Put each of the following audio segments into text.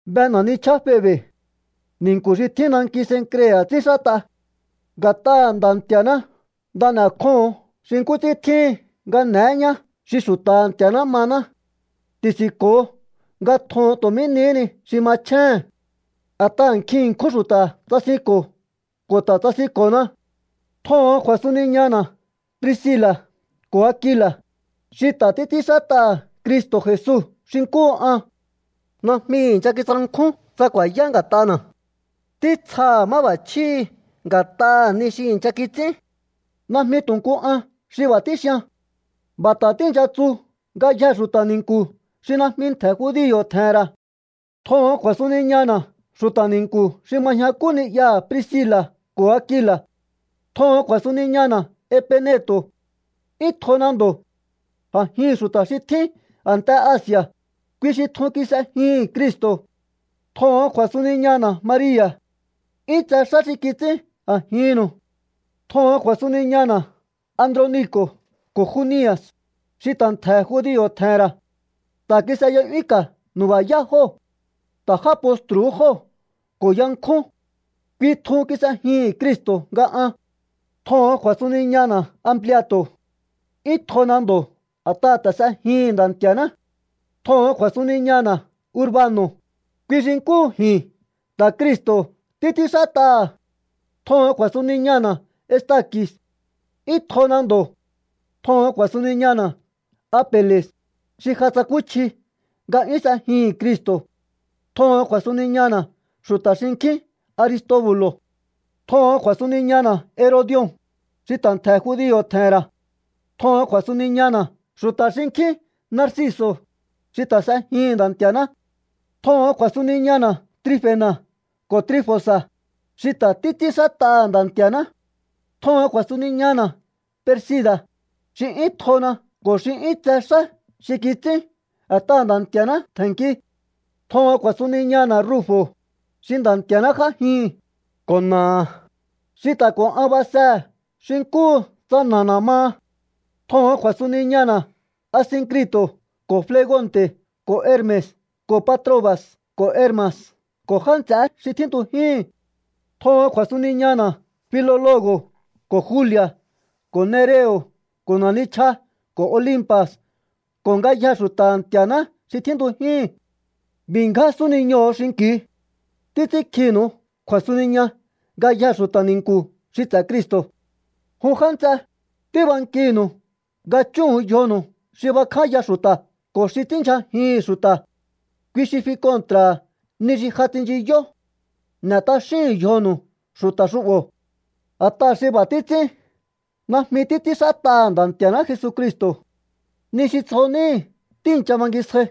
Be na̱ nichjaá Febe̱. Ni̱nku̱ xi tjín nanki Cencrea̱ ts'ínxát'a. Nga̱t'aha̱ Nda̱ Nti̱a̱ná nda n'e̱kjóho̱ón xi nkú ts'ín tjíhin nga n'e̱é ñá xi xu̱ta̱ha̱ Nti̱a̱ná mahaná. Ti̱si̱nko̱o nga tjoho̱on tu̱ mí nihí ni xi machjéhe̱n. A̱t'aha̱ nkjin ṉkjún xu̱ta̱ tsasinko̱ ko̱ ta̱ tsasinko̱na. Tjoho̱on kju̱a̱suniñana̱ Priscila̱ ko̱ Akila̱, xi ta̱ títs'ínxát'aha̱ Cristo̱ Jesu xi nkúhu an. Najmi i̱ncha kitsankjún tsa ku̱a̱yá nga̱t'ana̱. Títsjaha̱ máb'a̱chjíhi̱ nga̱t'aha̱ ni xi i̱ncha kits'ín. Najmi tu̱ nku an xi b'a̱ tíxian. B'a̱ ta̱ tíi̱ncha tsu ngayjee̱ xu̱ta̱ ni̱nku̱ xi najmi ntje̱ judio̱ tje̱he̱n ra̱. Tjoho̱on kju̱a̱suniñana̱ xu̱ta̱ ni̱nku̱ xi ma ñjakú ni'yaha̱ Priscila̱ ko̱ Akila̱. Tjoho̱on kju̱a̱suniñana̱ Epeneto̱. 'Yún tjona ndo̱. A̱jihi̱n xu̱ta̱ xi tjín a̱nte Asi̱a̱, kui xi tjun kis'ejihi̱n Cristo̱. Tjoho̱on kju̱a̱suniñana̱ Maria̱. 'Yún tse xá xi kits'ín a̱jinnu̱u. Tjoho̱on kju̱a̱suniñana̱ Androniko̱ ko̱ Juni̱a̱s, xi ta̱ ntje̱ judio̱ tje̱he̱n ra̱. Ta̱ kis'eya'yúnka̱ nu̱ba̱yá jóo̱. Ta̱ já postru̱hú jóo̱ ko̱ yankjún. Kui tjun kis'ejihi̱n Cristo̱ nga an. Tjoho̱on kju̱a̱suniñana̱ Ampliato̱. 'Yún tjona ndo̱ a̱t'aha̱ ta̱ s'ejihi̱n Nda̱ Nti̱a̱ná. Tjoho̱on kju̱a̱suniñana̱ Urbano̱, kui xi nkúhu ji̱n ta̱ Cristo̱ títs'ínxát'aha̱. Tjoho̱on kju̱a̱suniñana̱ Estaki̱s. 'Yún tjona ndo̱. Tjoho̱on kju̱a̱suniñana̱ Apele̱s, xi ja tsakúchji nga 'yún s'ejihi̱n Cristo̱. Tjoho̱on kju̱a̱suniñana̱ xu̱ta̱ xinkjín Aristobu̱lo̱. Tjoho̱on kju̱a̱suniñana̱ Herodi̱o̱n, xi ta̱ ntje̱ judio̱ tje̱he̱n ra̱. Tjoho̱on kju̱a̱suniñana̱ xu̱ta̱ xinkjín Narciso̱, xi ta̱ s'ejihi̱n Nda̱ Nti̱a̱ná. Tjoho̱on kju̱a̱suniñana̱ Trifena̱ ko̱ Trifosa̱, xi ta̱ títs'ínxát'aha̱ Nda̱ Nti̱a̱ná. Tjoho̱on kju̱a̱suniñana̱ Persi̱da̱, xi 'yún tjona ko̱ xi 'yún tse xá xi kits'ín a̱t'aha̱ Nda̱ Nti̱a̱ná tje̱nki. Tjoho̱on kju̱a̱suniñana̱ Rufo̱, xi Nda̱ Nti̱a̱ná j'ájihi̱n, ko̱ na̱aha̱, xi ta̱ ko̱ an basehe̱ xi nkúhu tsa na̱ana̱ maha. Tjoho̱on kju̱a̱suniñana̱ Asinkri̱to̱ ko̱ Flegonte̱ ko̱ Herme̱s ko̱ Patroba̱s ko̱ Herma̱s ko̱ já nts'eé xi tjíntujíhi̱n. Tjoho̱on kju̱a̱suniñana̱ Filolo̱go̱ ko̱ Juli̱a̱ ko̱ Nereo̱ ko̱ na̱ nichja ko̱ Olimpa̱s ko̱ ngayjee̱ xu̱ta̱ha̱ Nti̱a̱ná xi tjíntujíhi̱n. B'i̱ ngján súniñoho̱o xinki̱u. Títs'ínkjinu̱u kju̱a̱suniña ngayjee̱ xu̱ta̱ ni̱nku̱ xi ts'e̱ Cristo̱. Jun já nts'e, tíbankinu̱u nga chúhu̱un yjonu̱u xi bakjánya xu̱ta̱ ko̱ xi ts'ínndyjajihi̱n xu̱ta̱. Kui xi fi kontra̱ha̱ ni xi ja tsinchiyó. N'e̱ t'axíhu̱un yjonu̱u xu̱ta̱ xu'bo̱. A̱t'aha̱ xi b'a̱ títs'ín najmi títs'ínxát'aha̱ Nda̱ Nti̱a̱ná Jesucristo̱. Ni xi tsjo níhi̱ tíi̱ncha bangisjai.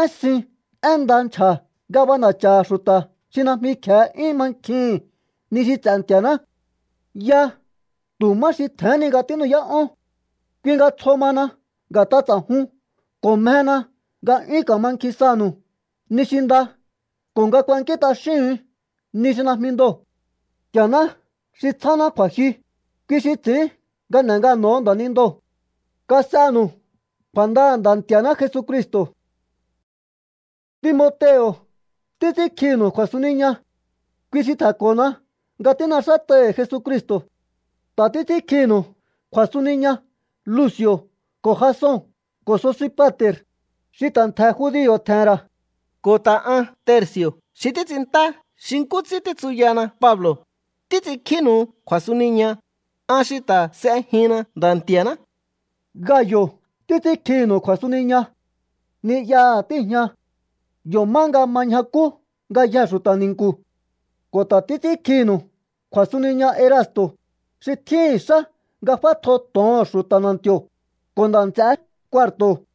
Én sin én nda nchja̱ nga b'ana̱cha̱ha̱ xu̱ta̱ xi najmi kje̱e 'yún mankjihi̱n ni xi ts'e̱ Nti̱a̱ná. Ya tu̱ má xi tje̱hén ni nga tínu'yá'ón. Kui nga tsjo mahana nga̱t'a ts'a̱jun ko̱ mjena nga 'yún ka̱mankjin sanu̱u ni xi nda ko̱ nga kuankín t'axíhu̱un ni xi najmi ndoo̱. Nti̱a̱ná xi tsjáná kju̱a̱jyu, kui xi ts'i̱ín nga n'e̱ ngano̱ho̱ nda̱nindoo̱. Kas'enu̱u kju̱a̱ndaha̱ Nda̱ Nti̱a̱ná Jesucristo̱. Timoteo̱ títs'ínkjinu̱u kju̱a̱suniña. Kui xi tje̱nko̱na nga tín'exát'ai̱hi̱ Jesucristo̱. Ta̱ títs'ínkjinu̱u kju̱a̱suniña Luci̱o̱ ko̱ Jason ko̱ Sosipa̱te̱r, xi ta̱ ntje̱ judio̱ tje̱he̱n ra̱. Ko̱ ta̱ an Terci̱o̱ xi títs'inntá xi nkú ts'ín títsuyana Pablo̱, títs'inkjínu̱u kju̱a̱suniña, an xi ta̱ s'ejinna Nda̱ Nti̱a̱ná. Gayo̱ títs'ínkjinu̱u kju̱a̱suniña. Ni'yaha̱ tíi̱jña. Yo̱ má nga ma ñjakú ngayjee̱ xu̱ta̱ ni̱nku̱. Ko̱ ta̱ títs'ínkjinu̱u kju̱a̱suniña Erasto̱, xi tjíhi̱n xá nga f'átjo to̱oho̱n xu̱ta̱ na̱nti̱o̱, ko̱ ta̱ nda̱ nts'eé Cuarto̱.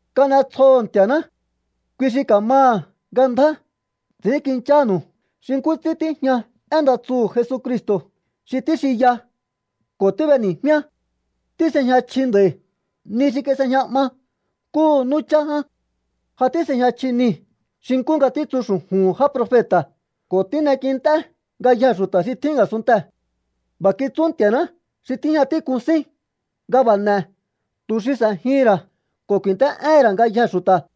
Kan'etsjoho̱ Nti̱a̱ná. Kui xi ka̱maha̱ nga ndjá ts'i̱ínkinchánu̱u xi nkú ts'ín tíjña én nda tsuhu̱ Jesucristo̱ xi tíxinya ko̱ tíb'eni̱jmíá. Tís'ejña chji nd'a̱i̱ ni xi kis'ejña 'ma nkúhu nú chá ján. Ja tís'ejña chji nii̱ xi nkú nga títsu xu̱ju̱hu̱n já profeta̱ ko̱ tín'ekint'é ngayjee̱ xu̱ta̱ xi tjín a̱sunntee̱. B'a̱ kitsú Nti̱a̱ná xi tíjña tík'un sín nga b'a̱ n'e̱ tu̱ xi s'e̱jihi̱n ra̱ ko̱ ku̱i̱nt'é'éhe̱n ra̱ ngayjee̱ xu̱ta̱.